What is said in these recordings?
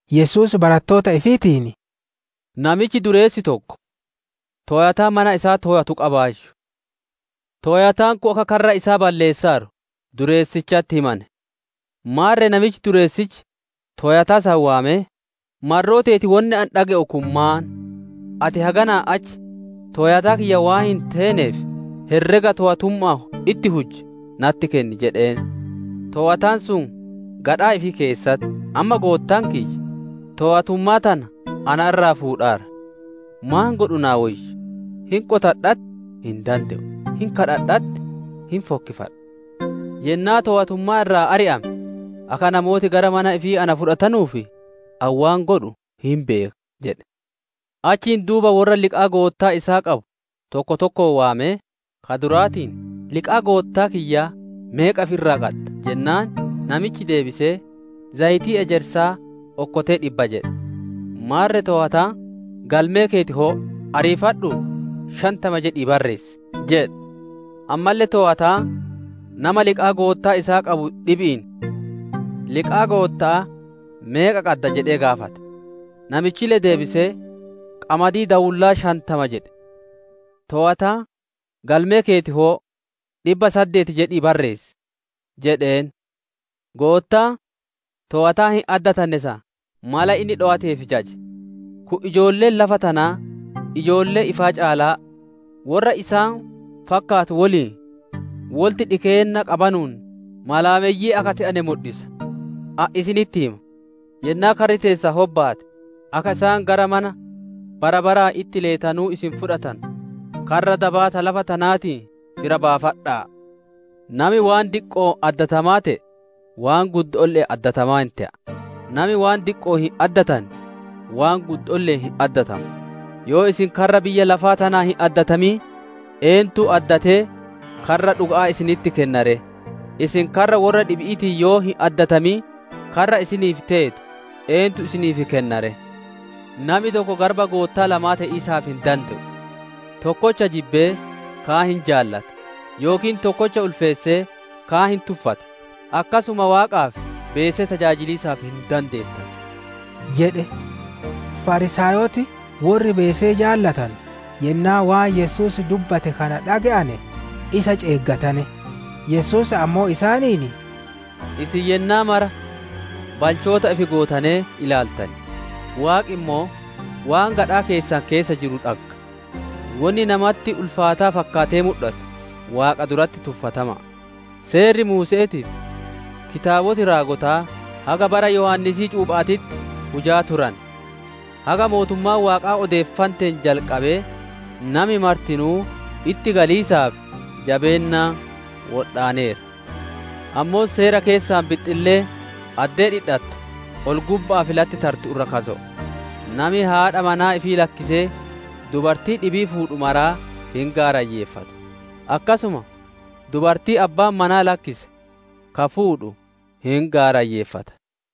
Yesuus barattoota ifiitiin, «Namichi dureessi tokko, toowataa mana isaa toowatu qabaayyu. Toowataan kun akka karra isaa balleessaaru dureessichatti himane. Maarre namichi dureessichi toowataa san waamee, ‹Marroo teeti wonni ani dhage'u kun maan? Ati haganaa achi toowataa kiyyaa waan hin teeneef, herrega toowatumma'aan itti hujje natti kenni› jedheen. Toowataan sun gadhaa ifii keessatti, ‹Amma goottaan kiyya toowatummaa tana na irraa fuudhaara, maan godhu naa woyya? Hin qotadha'atti hin dande'u, hin kadhadha'atti hin fokkifadha. Yennaa toowatummaa irraa ari'ame akka namooti gara mana ifii na fudhatanuuf, ani waan godhu hin beeka!› jedhe. Achiin duuba worra liqaa goottaa isaa qabu tokko tokkoon waamee, ka duraatiin, ‹Liqaa goottaa kiyyaa meeqa ifi irraa qadda?› jennaan, namichi deebisee, ‹Zayitii ejersaa okkotee dhibba› jedhe. Maarre toowataan, ‹Galmee keeti hoo'o; ariifadhuu shantama jedhii barreessi›. Ammalle toowataan, nama liqaa goottaa isaa qabu dhibi'iin, ‹Liqaa gootta'aa meeqa qadda?› jedhee gaafate. Namichille deebisee, ‹Qamadii daawullaa shantama› jedhe. Toowataan, ‹Galmee keeti hoo'o; dhibba saddeeti jedhii barreessi› jedheen. Goottaan, toowataa hin addatanne san mala inni dhowateef jaje. Kun ijoolleen lafa tanaa ijoollee ifaa caalaa worra isaan fakkaatu woliin wolitti dhikeenna qabanuun malaameyyii akka te'ane mudhisa. Ani isinitti hima, yennaa karri teessan hobbaate, akka isaan gara mana bara baraan itti leetanuu isin fudhatanu, karra dabaa ta lafa tanaatiin fira baafadha'a! «Nami waan diqqo'oon addatamaa te'e waan guddoolle'een addatamaa hin te'a. Nami waan diqqo'oon hin addatanne, waan guddoolle'een hin addatamu. Yoo isin karra biyya lafaa tanaan hin addatamin, eentu addatee karra dhuga'aa isinitti kenna ree? Isin karra worra dhibi'iitiin yoo hin addatamin, karra isiniif teetu eentu isiniif kenna ree? «Nami tokko garba goottaa lamaa te'iisaaf hin dande'u, tokkocha jibbee, kaan hin jaalata; yookiin tokkocha ulfeessee kaan hin tuffata. Akkasuma Waaqaa fi beesee tajaajiliisaaf hin dandeettanu» jedhe. Fariisaayoti worri beesee jaalatanu yennaa waan Yesuus dubbate kana dhage'ane isa ceeggatane. Yesuus ammoo isaaniin, «Isin yennaa maraa balchoota ifi gootanee ilaaltan, Waaqi ammoo waan gadhaa keessan keessa jiru dhagga, wonni nama duratti ulfaataa fakkaatee mudhatu, Waaqa duratti tuffatama'a. Seerri Muuse'eetii fi kitaaboti raagotaa haga bara Yohaannisii cuupha'aatitti hujaa turane. Haga mootummaan Waaqaa odeeffanteen jalqabee nami martinuu itti galiisaaf jabeennaan wodhaaneera. Ammoo Seera keessaa bixxilleen addee dhidhattu ol-gubba'aa fi latti tartu irra kaso'o. «Nami haadha manaa ifii lakkisee dubartii dhibii fuudhu maraa hin gaarayyeeffata. Akkasuma dubartii abbaan manaa lakkise ka fuudhu hin gaarayyeeffata.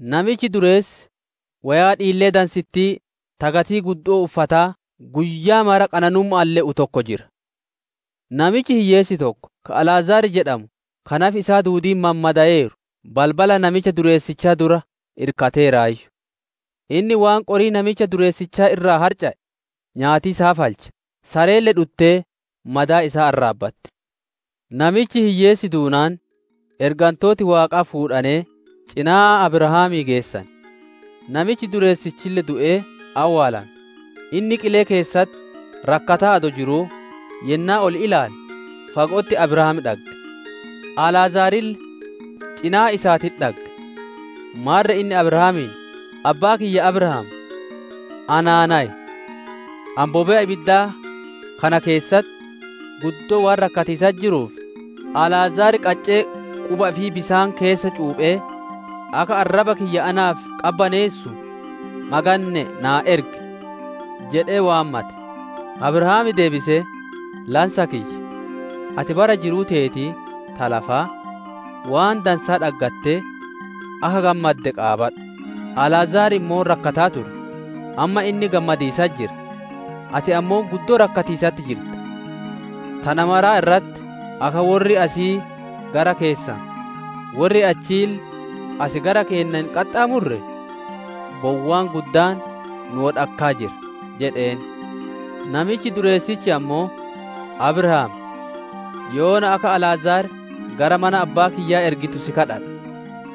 «Namichi dureessi woyaa dhiillee dansittii, ta gatii guddo'oo uffataa, guyyaa mara qananumma'aan le'u tokko jira. Namichi hiyyeessi tokko, ka Alaazar jedhamu, ka nafi isaa duudiin mammadaayeeru balbala namicha dureessichaa dura irkateeraayyu. Inni waan qorii namicha dureessichaa irraa harca'e nyaatiisaaf halcha. Sareelle dhuttee madaa isaa arraabbatti. Namichi hiyyeessi duunaan, ergantooti Waaqaa fuudhanee cinaa Abrahaamii geessane. Namichi dureessichille du'ee awwaalame. Inni qilee keessatti rakkataa adoo jiruu, yennaa ol ilaale, fago'otti Abrahaam dhagge; Alaazarille cinaa isaatitti dhagge. Maarre inni Abrahaamiin, ‹Abbaa kiyya Abrahaam naa nayi! Ani bobe'a ibiddaa kana keessatti guddoo waan rakkatiisatti jiruuf, Alaazar qaccee quba ifii bisaan keessa cuuphee akka arraba kiyya naaf qabbaneessu maganne'ee naa ergi› jedhee waammate. «Abrahaam deebisee, ‹Lansa kiyya, ati bara jiruu teeti ta lafaa, waan dansaa dhaggattee akka gammadde qaabadhu; Alaazar ammoo rakkataa ture. Amma inni gammadiisatti jira, ati ammoo guddoo rakkatiisatti jirta. Tana maraa irratti, akka worri asii gara keessan, worri achiille as gara keenna hin qaxxaamurre, bowwaan guddaan nu wodhakkaa jira› jedheen. Namichi dureessichi ammoo, ‹Abrahaam, yoona akka Alaazar gara mana abbaa kiyyaa ergitu si kadhadha.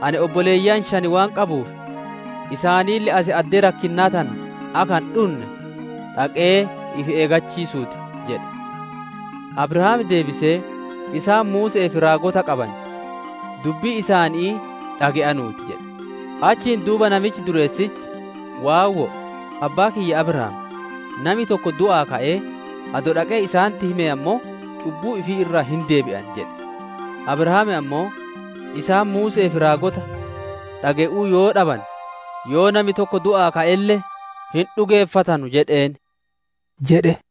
Ani obboleeyyan shan waan qabuuf, isaanille as addee rakkinnaa tana akka hin dhunne dhaqee ifi eeggachiisuu ti› jedhe. «Abrahaam deebisee, ‹Isaan Muuse'ee fi raagota qaban, dubbii isaanii dhage'anuu ti› jedhe. Achiin duuba namichi dureessichi, ‹Waawwoo, abbaa kiyya Abrahaam, nami tokko du'aa ka'ee adoo dhaqee isaanitti himee ammoo cubbuu ifii irraa hin deebi'an› jedhe. Abrahaam ammoo, ‹Isaan Muuse'ee fi raagota dhage'uu yoo dhabane, yoo nami tokko du'aa ka'elle hin dhugeeffatanu› jedheen» jedhe.